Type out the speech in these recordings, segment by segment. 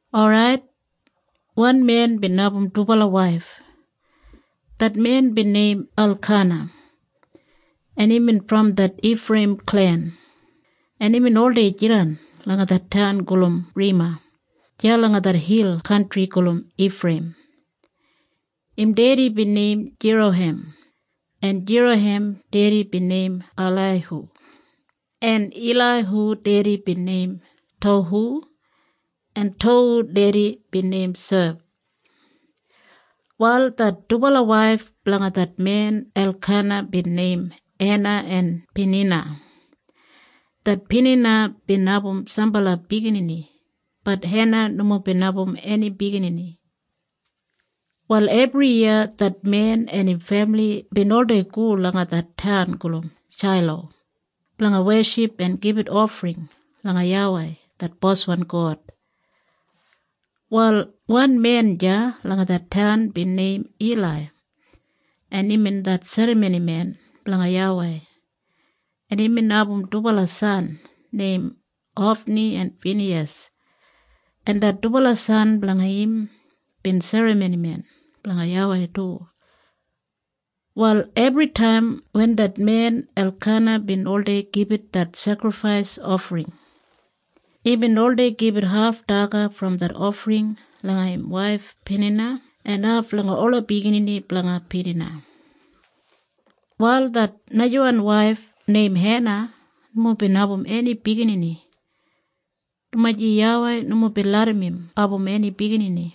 Orait, wan men bin abum dubala waif. Det men bin neim Elkana, en imbin brom det Ifreiyim klen, en imbin oldei jidan langa det taun gulum Rema deya langa det hil kantri gulum Ifreiyim. Im dedi bin neim Jeroham, en Jeroham dedi bin neim Ilaihu, en Ilaihu dedi bin neim Tohu, en Tohu dedi bin neim Suf. Wal det dubala waif blanga det men Elkana bin neim Hena en Pinina. Det Pinina bin abum sambala biginini. Bat Hena nomo bin abum eni biginini. Wal ebriyiya det men en im femili bin oldei go langa det taun gulum Shailo blanga weship en gibit ofring langa YAWEI det Boswan God. Wal wan men deya langa det taun bin neim Ilai, en imbin det serramonimen blanga YAWEI, en imbin abum dubala san neim Hofni en Finiyas, en det dubala san blanga im bin serramonimen blanga YAWEI du. Wal ebritaim wen det men Elkana bin oldei gibit det sekrifais ofring, imbin oldei gibit haf daga brom det ofring langa im waif Pinina en haf langa ola biginini blanga Pinina. Wal det najawan waif neim Hena nomo bin abum eni biginini, dumaji YAWEI nomo bin larram im abum eni biginini,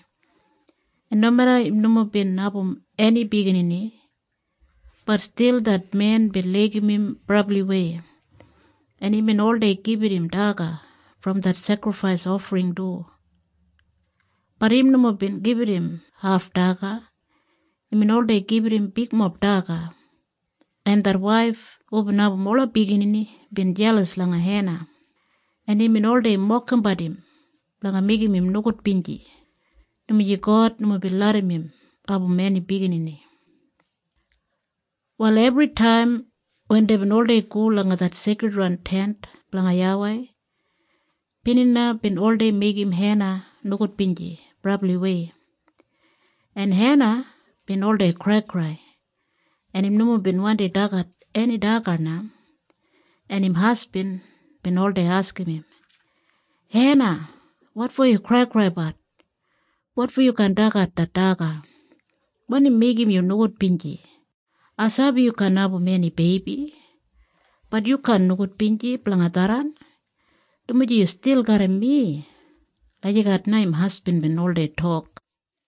en nomeda im nomo bin abum eni biginini, bat stil det men bin laigim im brabliwei, en imbin oldei gibit im daga brom det sekrifais ofring du. Bat im nomo bin gibit im haf daga. Imbin oldei gibit im bigmob daga. En det waif hubin abum ola biginini bin jelas langa Hena, en imbin oldei mokimbat im blanga meigim im nogudbinji, dumaji God nomo bin larram im abum eni biginini. Wal ebritaim wen deibin oldei go langa det Seikridwan Tent blanga YAWEI, Pinina bin oldei meigim Hena nogudbinji brabliwei, en Hena bin oldei kraikrai, en im nomo bin wandi dagat eni daga na, en im hasbin bin oldei askim im, “Hena, wotfo yu kraikraibat? Wotfo yu kaan dagat det daga? Wanim meigim yu nogudbinji? Ai sabi yu kaan abum eni beibi. Bat yu kaan nogudbinji blanga tharran, dumaji yu stil garram mi.” Lagijat na im hasbin bin oldei tok.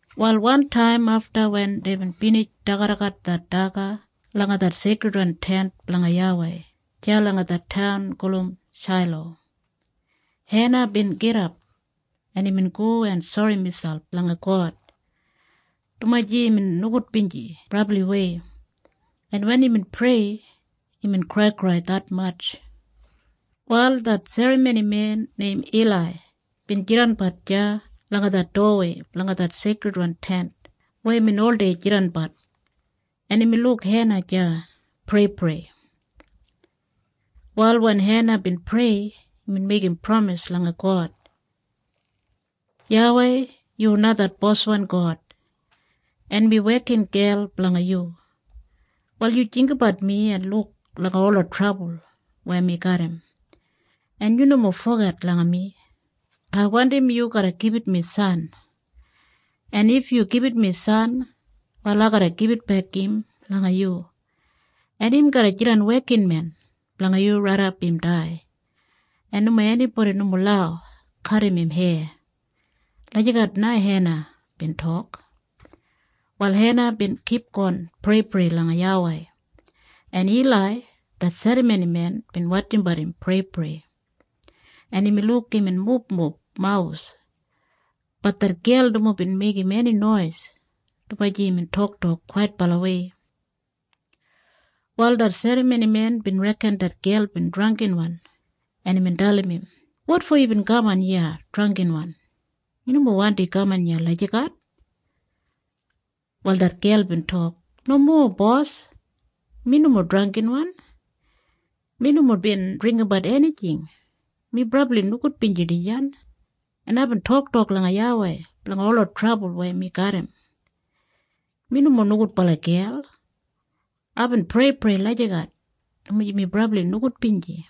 Wal wantaim afta wen deibin binij dagadagat det daga langa det Seikridwan Tent blanga YAWEI deya langa det taun gulum Shailo, Hena bin gidap, en imbin go en sori miselp langa God, dumaji imbin nogudbinji brabliwei, en wen imbin prei, imbin kraikrai detmatj. Wal det serramonimen neim Ilai bin jidanbat deya langa det dowawei blanga det Seikridwan Tent weya imbin oldei jidanbat, en imbin luk Hena deya preiprei. Wal wen Hena bin prei, imbin meigim pramis langa God. “YAWEI, yu na det boswan God, en mi wekingel blanga yu. Wal yu jinggabat mi en luk langa ola trabul weya mi garram, en yu nomo foget langa mi. Ai wandim yu garra gibit mi san. En if yu gibit mi san, wal ai garra gibitbek im langa yu, en im garra jidan wekinmen blanga yu raidap im dai, en nomo enibodi nomo lau kadim im heya.” Lagijat na Hena bin tok. Wal Hena bin kipgon preiprei langa YAWEI, en Ilai det serramonimen bin wotjimbat im preiprei, en imbin luk imbin mubmub mawus. Bat det gel nomo bin meigim eni nois, dumaji imbin toktok kwaitbalawei. Wal det serramonimen bin reken det gel bin drangginwan, en imbin dalim im, “Wotfo yubin kaman iya drangginwan? Yu nomo wandi kaman iya lagijat.” Wal det gel bin tok, “Nomo, bos. Mi nomo drangginwan. Mi nomo bin dringgimbat enijing. Mi brabli nogudbinji dijan, en aibin toktok langa YAWEI blanga ola trabul weya mi garram. Mi nomo nogudbala gel. Aibin preiprei lagijat dumaji mi brabli nogudbinji.”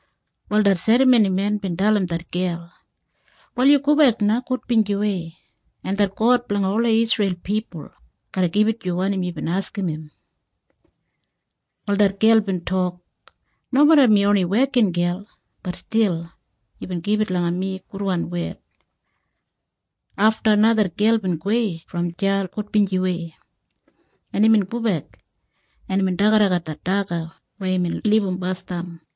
Wal det serramonimen bin dalim det gel, “Wal yu gobek na gudbinjiwei, en det God blanga ola Isreil pipul garra gibit yu wanim yubin askim im.” Wal det gel bin tok, “Nomeda mi oni wekingel, bat stil yubin gibit langa mi gudwan wed.” Afta na det gel bin gowei brom deya gudbinjiwei, en imbin gobek, en imbin dagadagat det daga weya imbin libum basdam.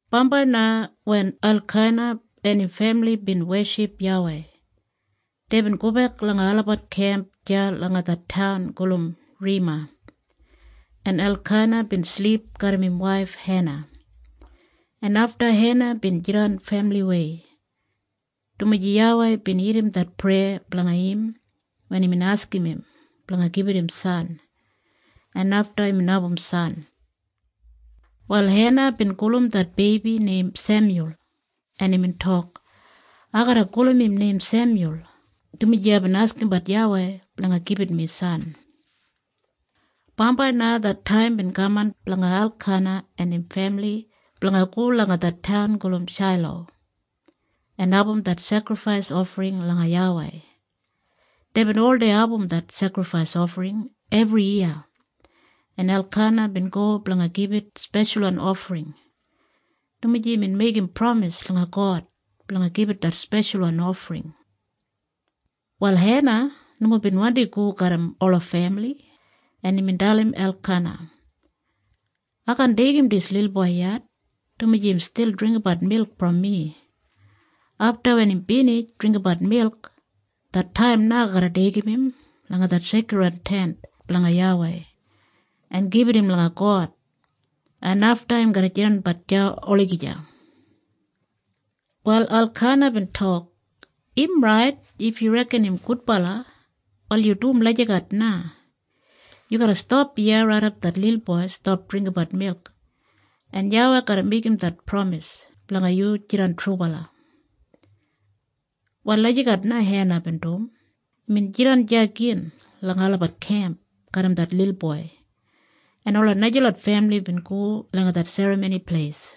Bambai na wen Elkana en im femili bin weship YAWEI, deibin gobek langa olabat kemp deya langa det taun gulum Rema, en Elkana bin silip garram im waif Hena, en afta Hena bin jidan femiliwei, dumaji YAWEI bin irrim det preya blanga im weya imbin askim im blanga gibit im san, en afta imbin abum san. Wal Hena bin gulum det beibi neim Semyul, en imbin tok, “Ai garra gulum im neim Semyul, dumaji aibin askimbat YAWEI blanga gibit mi san.” Bambai na det taim bin kaman blanga Elkana en im femili blanga go langa det taun gulum Shailo en abum det sekrifais ofring langa YAWEI. Deibin oldei abum det sekrifais ofring ebriyiya, en Elkana bin go blanga gibit speshalwan ofring, dumaji imbin meigim pramis langa God blanga gibit det speshalwan ofring. Wal Hena nomo bin wandi go garram ola femili, en imbin dalim Elkana, “Ai kaan deigim dis lilboi yet, dumaji im stil dringgimbat milk brom mi. Afta wen im binij dringgimbat milk, det taim na ai garra deigim im langa det Seikridwan Tent blanga YAWEI en gibit im langa God, en afta im garra jidanbat deya olagija.” Wal Elkana bin tok, “Im rait. If yu reken im gudbala, wal yu dum lagijat na. Yu garra stap iya raidap det lilboi stap dringgimbat milk. En YAWEI garra meigim det pramis blanga yu jidan trubala.” Wal lagijat na Hena bin dum. Imbin jidan deya gin langa olabat kemp garram det lilboi, en ola najalot femili bin go langa det Serramoni Pleis.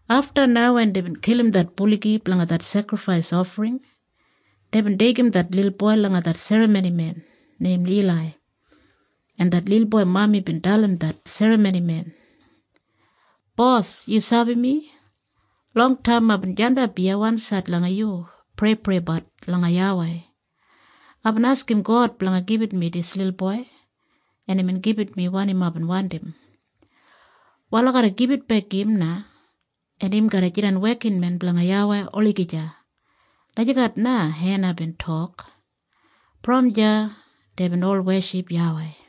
Afta na wen deibin kilim det buligi blanga det sekrifais ofring, deibin deigim det lilboi langa det serramonimen neim Ilai, en det lilboi mami bin dalim det serramonimen, “Bos, yu sabi mi? Longtaim aibin jandap iya wansaid langa yu preipreibat langa YAWEI. Aibin askim God blanga gibit mi dis lilboi, en imbin gibit mi wanim aibin wandim. Wal ai garra gibitbek im na, en im garra jidan wekinmen blanga YAWEI olagija.” Lagijat na Hena bin tok. Brom deya deibin ol weship YAWEI.